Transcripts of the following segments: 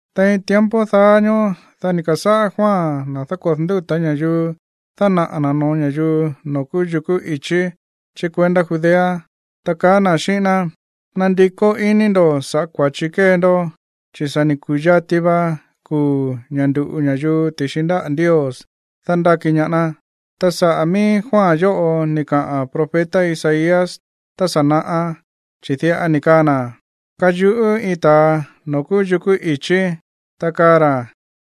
Tein tiempo daá ñóó, dá ni̱ ka̱sáꞌá Juan, na̱ dákodo̱ ndúta̱ ña̱yuu, dánaꞌa̱ na̱ no̱ó ña̱yuu noo̱ kúú yukú i̱chí chí kuendá Judea, ta kaá na̱ xíꞌín ná: ―Nandikó iní ndo̱ sa̱ꞌá kua̱chi kée ndó, chi̱ sa̱ ni̱ ku̱yati va kuu̱ ña̱ ndu̱ꞌu ña̱yuu ti̱xi ndáꞌa̱ Ndios dándáki ñaá ná. Ta saꞌa̱ mií Juan yóꞌo ni̱ kaꞌa̱n profeta Isaías tá sa̱ naꞌá, chi̱ diꞌa ni̱ kaa na̱: Kayuꞌú iin ta̱a noo̱ kúú yukú i̱chí, ta kaa ra̱: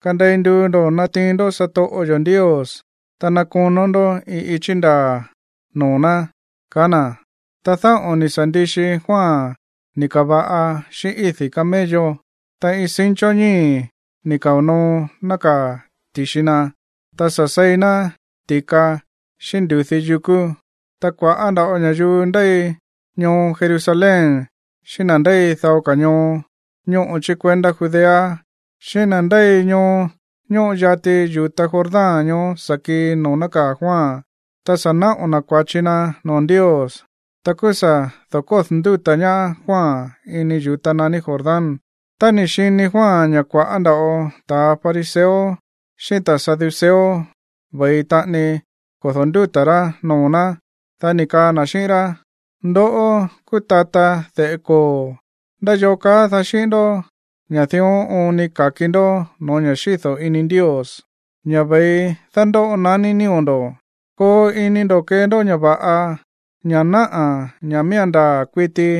“Kandei nduu ndo̱ natiin ndó satoꞌo yo̱ Ndios, ta ná konó ndó iin ichí ndaa̱ noo̱ ná”, kaá na̱. Ta dáꞌo̱n ni̱ sa̱ ndixi Juan ni̱ ka̱va̱ꞌa xíꞌín ídi̱ camello. Ta iin cincho ñíi̱ ni̱ kao̱ noo nákaa̱ ti̱xi na. Ta sa̱ seí ná ti̱ka xíꞌín ndu̱dí yukú. Ta kua̱ꞌá nda̱ꞌo ña̱yuu ndéi ñoo Jerusalén xíꞌín na̱ ndéi dao ka̱ ñoo ñóꞌo chí kuendá Judea xíꞌín na̱ ndéi ñoo ñóꞌo yati yu̱ta Jordán ñoó sa̱ kii noo̱ nákaa̱ Juan. Ta sa̱ naꞌo̱ na̱ kua̱chi na̱ noo̱ Ndios, ta kúú sa̱ da̱kódo̱ ndúta̱ ñaá Juan ini yu̱ta naní Jordán. Tá ni̱ xini Juan ña̱ kua̱ꞌá nda̱ꞌo ta̱ fariseo xíꞌín ta̱ saduceo ve̱i taꞌani kodo̱ ndúta̱ rá noo̱ ná, dá ni̱ kaa na̱ xíꞌín rá: ―¡Ndoꞌó kúú tata de̱ꞌe koo̱! ¿Ndá yoo kaá daá xíꞌín ndoꞌó ña̱ dión oon ni ka̱ki ndó no̱ó ña̱ xído̱ ini Ndios, ña̱ ve̱i dándóꞌo naní nío̱ ndo̱? Koo ini ndo̱ kee ndó ña̱ va̱ꞌa, ña̱ náꞌa̱ ña̱ miía̱n ndaa̱ kuiti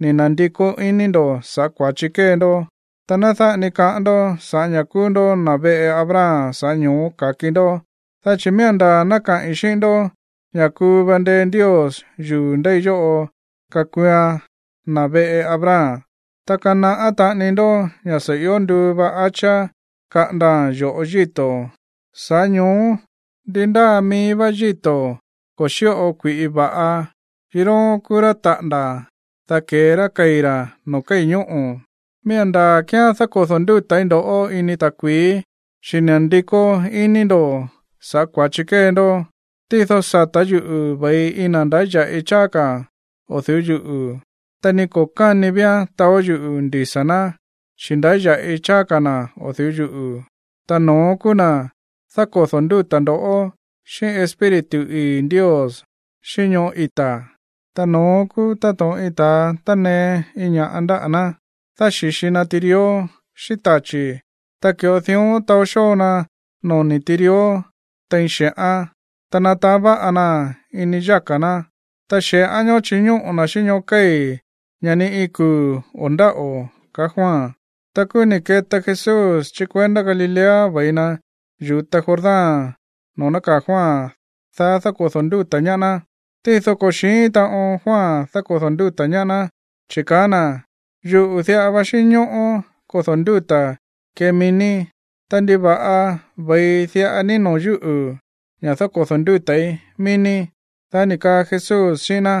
ni̱ na̱ndikó iní ndo̱ saꞌa̱ kua̱chi kée ndó. Ta ná dáꞌa ni kaꞌán ndó ña̱ sa̱ꞌá ña̱ kúú ndó na̱ veꞌe Abraham, sa̱ꞌá ño̱ó ka̱ki ndó. Dá chi̱ miía̱n ndaa̱ ná kaꞌi̱n xíꞌín ndó ña̱ kuu va ndee Ndios yuu̱ ndéi yóꞌo kakuuan na̱ veꞌe Abraham. Ta kanaꞌá taꞌani ndó ña̱ sa̱ ió nduu va hacha kaꞌandaa̱n yo̱ꞌo yíto̱, sa̱ꞌá ño̱ó ndi ndáa mií vá yíto̱ ko̱ xíꞌo kui̱ꞌi va̱ꞌa, yiróón kúú rá taꞌa̱nda̱, dá ke̱e ra kei̱ ra̱ noo̱ kéi̱ ñóꞌo̱. ’Miía̱n ndaa̱ kíán dákodo̱ ndúta̱í ndo̱ꞌó ini ta̱kui̱í, chi̱ ni̱ na̱ndikó iní ndo̱ sa̱ꞌá kua̱chi kée ndó. Tído sata̱ yúꞌu̱ ve̱i iin na̱ ndáya̱ꞌi cháá ka̱ o̱ du̱ú yuꞌu̱, ta ni ko̱ káni víán taó yuꞌu̱ ndisa̱ ná, chi̱ ndáya̱ꞌi cháá ka̱ na̱ o̱ du̱ú yuꞌu̱. Ta no̱ón kúú na̱ dákodo̱ ndúta̱ ndo̱ꞌó xíꞌín Espíritu ii̱ Ndios, xíꞌín ñoꞌó ita̱. Ta no̱ón kúú táto̱ꞌon iin ta̱a tánee iin ña̱ꞌa ndáꞌa̱ ná dáxi̱xi na tirió xíꞌín tachi̱. Ta ki̱ꞌo dión taó xóo na noni̱ tirió tein xe̱ꞌán. Ta nataán va̱ꞌa naa̱n ini yáka̱ ná, ta xe̱ꞌán ñoó chiñóꞌo̱ na̱ xíꞌín ñóꞌo̱ kéi̱, ña̱ ni iin kuu̱ o̱ ndáꞌo̱ ―kaá Juan. Ta kúú ni̱ keta Jesús chí kuendá Galilea ve̱i na̱ yu̱ta Jordán noo̱ nákaa̱ Juan, dá dákodo̱ ndúta̱ ñaá ná. Tído ko̱ xi̱ín taꞌon Juan dákodo̱ ndúta̱ ñaá ná, chi̱ kaá na̱: ―Yuꞌu̱ diꞌa va xínñóꞌó kodo̱ ndúta̱ kee mií ní. Ta, ¿ndiva̱ꞌa ve̱i diꞌa ní noo̱ yúꞌu̱ ña̱ dákodo̱ ndúta̱í mií ní? Dá ni̱ kaa Jesús xíꞌín ná: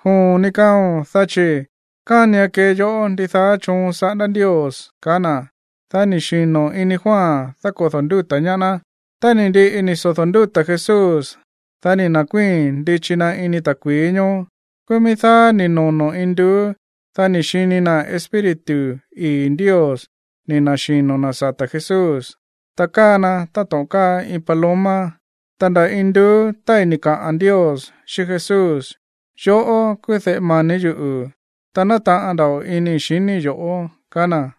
―Joon ní kaao̱n, dá chi̱ kánian kee yó ndidaá choon saꞌándá Ndios ―kaá na̱. Dá ni̱ xino̱ ini Juan dákodo̱ ndúta̱ ñaá ná. Tá ni̱ ndiꞌi ni̱ sodo̱ ndúta̱ Jesús, dá ni̱ na̱kuíi̱n ndichi na̱ ini ta̱kui̱í ñoó. Kúú mií dáá ni̱ nonó induú. Dá ni̱ xini na̱ Espíritu ii̱ Ndios ni̱ na̱xino̱ na̱ sata̱ Jesús, ta káa na táto̱ꞌon káa iin paloma. Ta nda̱ induú tái̱ ni̱ kaꞌa̱n Ndios xíꞌín Jesús: ―Yoꞌó kúú de̱ꞌe mani̱ yuꞌu̱, ta nátaꞌan nda̱ꞌo inii̱ xiníi̱ yo̱ꞌó ―kaá na̱.